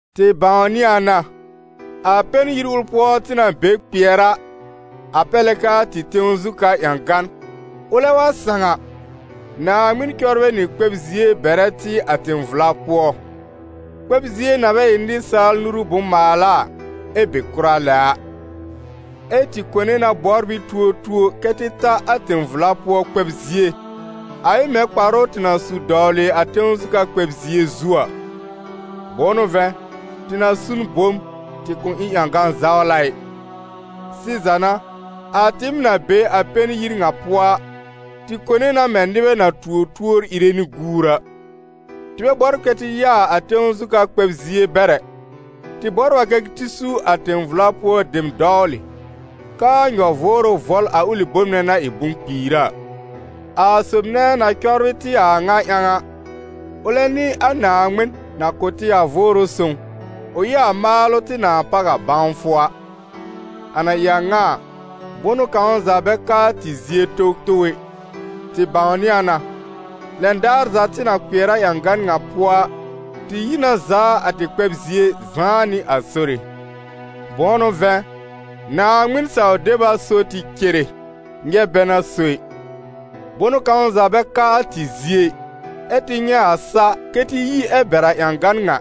Tɩ bãwnɩ a na, a pɛn yir ʋl pʋɔ tɩ na be kpɩɛr a (a pɛr lɛ k'aa tɩ tẽw zu ka ƴãgan) ʋlɛ wa sãw a, Naaŋmɩn cɔbrɛ nɩ kpɛb-zie bɛrɛ tɩ a tẽ-vla pʋɔ, kpɛb-zie na bɛ ɩ nɩsaal nuru bʋ̃-maala a, ɛ be kʋra lɛ a. Ɛ tɩ kone na bɔbr ɩ tuotuo kɛ tɩ ta a tẽ-vla pʋɔ kpɛb-zie, a ɩ mɛ̃ kparʋ tɩ na su dɔwlɩ a tẽw zu ka kpɛb-zie zu a. Bʋ̃ʋ n'ʋ vɛ̃, tɩ na su n bom, tɩ kʋ̃ ɩ ƴãgã-zawla ɩ. Sɩza n'a, a tɩɩm na be a pɛn yir ŋa pʋɔ a, tɩ kone na mɛ̃ nɩbɛ na tuo tuor ìre nɩ guur a. Tɩ bɛ bɔbr kɛ tɩ yaa a tẽw zu ka kpɛb-zie bɛr ɛ, tɩ bɔbr a kɛ tɩ su a tẽ-vla pʋɔ dem dɔwlɩ, k'aa nyɔ-vʋʋrʋ vɔl a ʋlɩ bom nɛ na ɩ bʋ̃-kpiira. A sob nɛ na cɔbrɩ tɩ a a ŋa ƴãw a, ʋlɛ n'ɩ a Naaŋmɩn, na kʋ̀ tɩ a Vʋʋrʋ Sõw, ʋ ɩ a maalʋ tɩ nãa páw a bãwfʋ a. A na ɩ a ŋa a, bʋnʋ kãw za bɛ ka a tɩ zie towtow ɛ, tɩ bãwnɩ a na, lɛn daar za tɩ na kpɩɛr a ƴãgan ŋa pʋɔ a, tɩ yi na zaa a tɩ kpɛb-zie zãá nɩ a Sore. Bʋ̃ʋ n'ʋ vɛ̃, Naaŋmɩn saw-deb a so tɩ cere, nyɛb bɛ n'a so ɩ. Bʋnʋ kãw za bɛ ka a tɩ zie ɩ, ɛ́ tɩ nyɛ̃ a sa kɛ tɩ yi ɛ bɛr a ƴãgan ŋa,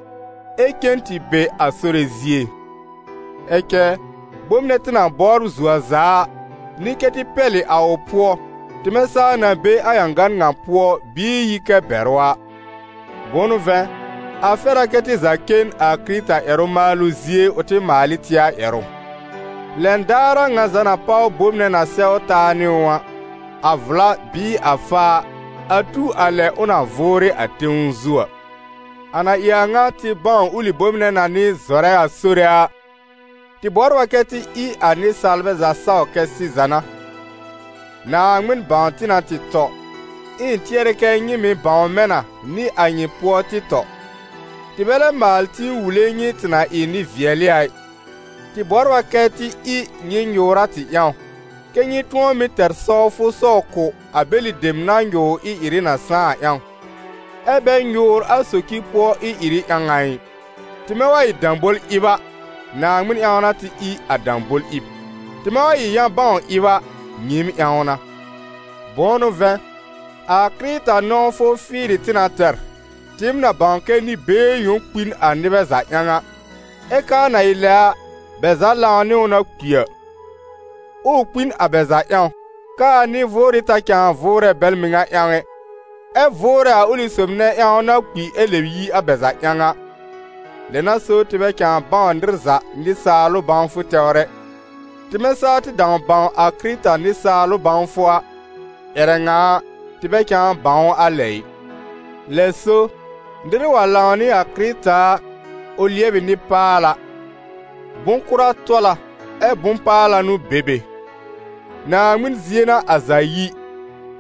ɛ cen tɩ be a Sore zie. Ɛ cɛ bom nɛ tɩ na bɔbr zuo a za a, n'ɩ kɛ tɩ pɛlɩ a ʋ pʋɔ, tɩmɛ saa na be a ƴãgan ŋa pʋɔ bɩɩ yi kɛ bɛr ʋ a. Bʋ̃ʋ n'ʋ vɛ̃, a fɛr a kɛ́ tɩ za cen a Kɩrɩta ƴɛrʋ-maalʋ zie ʋ tɩ maal ɩ tɩ a ƴɛrʋ. Lɛn daar a ŋa za na páw bom nɛ na sɛw taa nɩ ʋ a, a vla bɩɩ a faa, a tu a lɛ ʋ na vʋʋrɩ a tẽw zu a. A na ɩ a ŋa tɩ bãw ʋlɩ bom nɛ na n'ɩ a zɔrɛ-a-Sore a, tɩ bɔbr a kɛ tɩ ɩ a nɩsaalbɛ za saw kɛ sɩza n'a. Naaŋmɩn bãw tɩ na tɩ tɔ, ɛ ɩ̃ tɩɛr kɛ nyɩ mɩ̀ bãw mɛ̃ na nɩ a nyɩ pʋɔ tɩ tɔ. Tɩ bɛ lɛb maal tĩ wule nyɩ tɩ na ɩ nɩ-vɩɛlɩ a ɩ, tɩ bɔbr a kɛ́ tɩ ɩ nyɩ nyʋʋr a tɩ ƴãw, kɛ́ nyɩ tʋ̃ɔ mɩ́ tɛr sɔwfʋ sɔw kʋ̀ a bɛlɩ dem na nyʋʋr ɩ-ɩrɩ na sãá a ƴãw, ɛ bɛ nyʋʋr a socir pʋɔ ɩ-ɩrɩ ƴãw a ɩ. Tɩmɛ wa ɩ dãbol-ɩb a, Naaŋmɩn ƴãw n'a tɩ ɩ a dãbol-ɩb; tɩmɛ wa ɩ yã-bãw-ɩb a, nyɩɩm ƴãw n'a. Bʋ̃ʋ n'ʋ vɛ̃, a Kɩrɩta nɔ̃wfʋ fɩɩrɩ tɩ na tɛr, tɩɩm na bãw kɛ nɩ-been yõ kpi n a nɩbɛ za ƴãw a, ɛ k'aa na ɩ lɛ a, bɛ za lãw nɩ ʋ na kpi a. Ɛ ʋ kpi n a bɛ za ƴãw, k'aa nɩ-vʋʋrɩ ta cãa vʋʋrɛ bɛl mɩŋa ƴãw ɛ, ɛ vʋʋrɛ a ʋlɩ sob nɛ ƴãw na kpi ɛ lɛb yi a bɛ ƴãw a. Lɛ n'a so tɩ bɛ cãa bãw nɩr za nɩsaalʋ bãwfʋ tɛwr ɛ. Tɩmɛ saa tɩ dãw bãw a Kɩrɩta nɩsaalʋ bãwfʋ a, ƴɛrɛ ŋa a, tɩ bɛ cãa bãw ʋ a lɛ ɩ. Lɛ so nɩr wa lãw nɩ a Kɩrɩta a, ʋ lɩɛb ɩ nɩ-paala. Bʋ̃-kʋra tɔl a ɛ bʋ̃-paala n'ʋ be be. Naaŋmɩn zie n'a a za yi,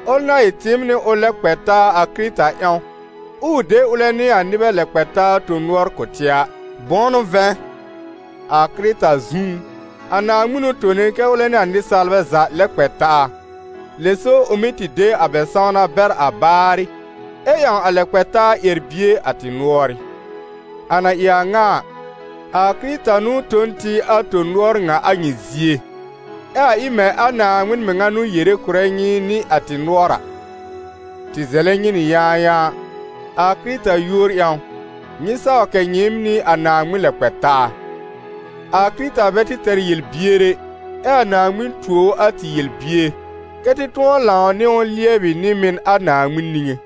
ʋl na ɩ tɩɩm nɩ ʋl lɛ kpɛ taa a Kɩrɩta ƴãw, ɛ ʋ de ʋlɛ nɩ a nɩbɛ lɛ-kpɛ-taa tõ-nʋɔr kʋ̀ tɩ a. Bʋ̃ʋ n'ʋ vɛ̃, a Kɩrɩta zũú, a Naaŋmɩn n'ʋ tone kɛ́ ʋlɛ nɩ a nɩsaalbɛ za lɛ kpɛ taa, lɛ so ʋ mɩ́ tɩ de a bɛ sãwna bɛr a baarɩ, ɛ ƴãw a lɛ-kpɛ-taa ƴɛr-bie a tɩ nʋɔrɩ́. A na ɩ a ŋa a, a Kɩrɩta n'ʋ tõ n tɩ a tõ-nʋɔr ŋa a nyɩ zie, ɛ a ɩ mɛ̃ a Naaŋmɩn mɩŋa n'ʋ yere kʋ̀rɛ nyɩ nɩ a tɩ nʋɔr a: tɩ zɛlɛ nyɩ nɩ yãayãa, a Kɩrɩta yúor ƴãw, nyɩ saw kɛ̀ nyɩɩm nɩ a Naaŋmɩn lɛ kpɛ taa. A Kɩrɩta bɛ tɩ tɛr yel-bier ɛ, ɛ a Naaŋmɩn tuo ʋ a tɩ yel-bier, kɛ́ tɩ tʋ̃ɔ lãw nɩ ʋ lɩɛbɩ nɩ-mɩn a Naaŋmɩn niŋé.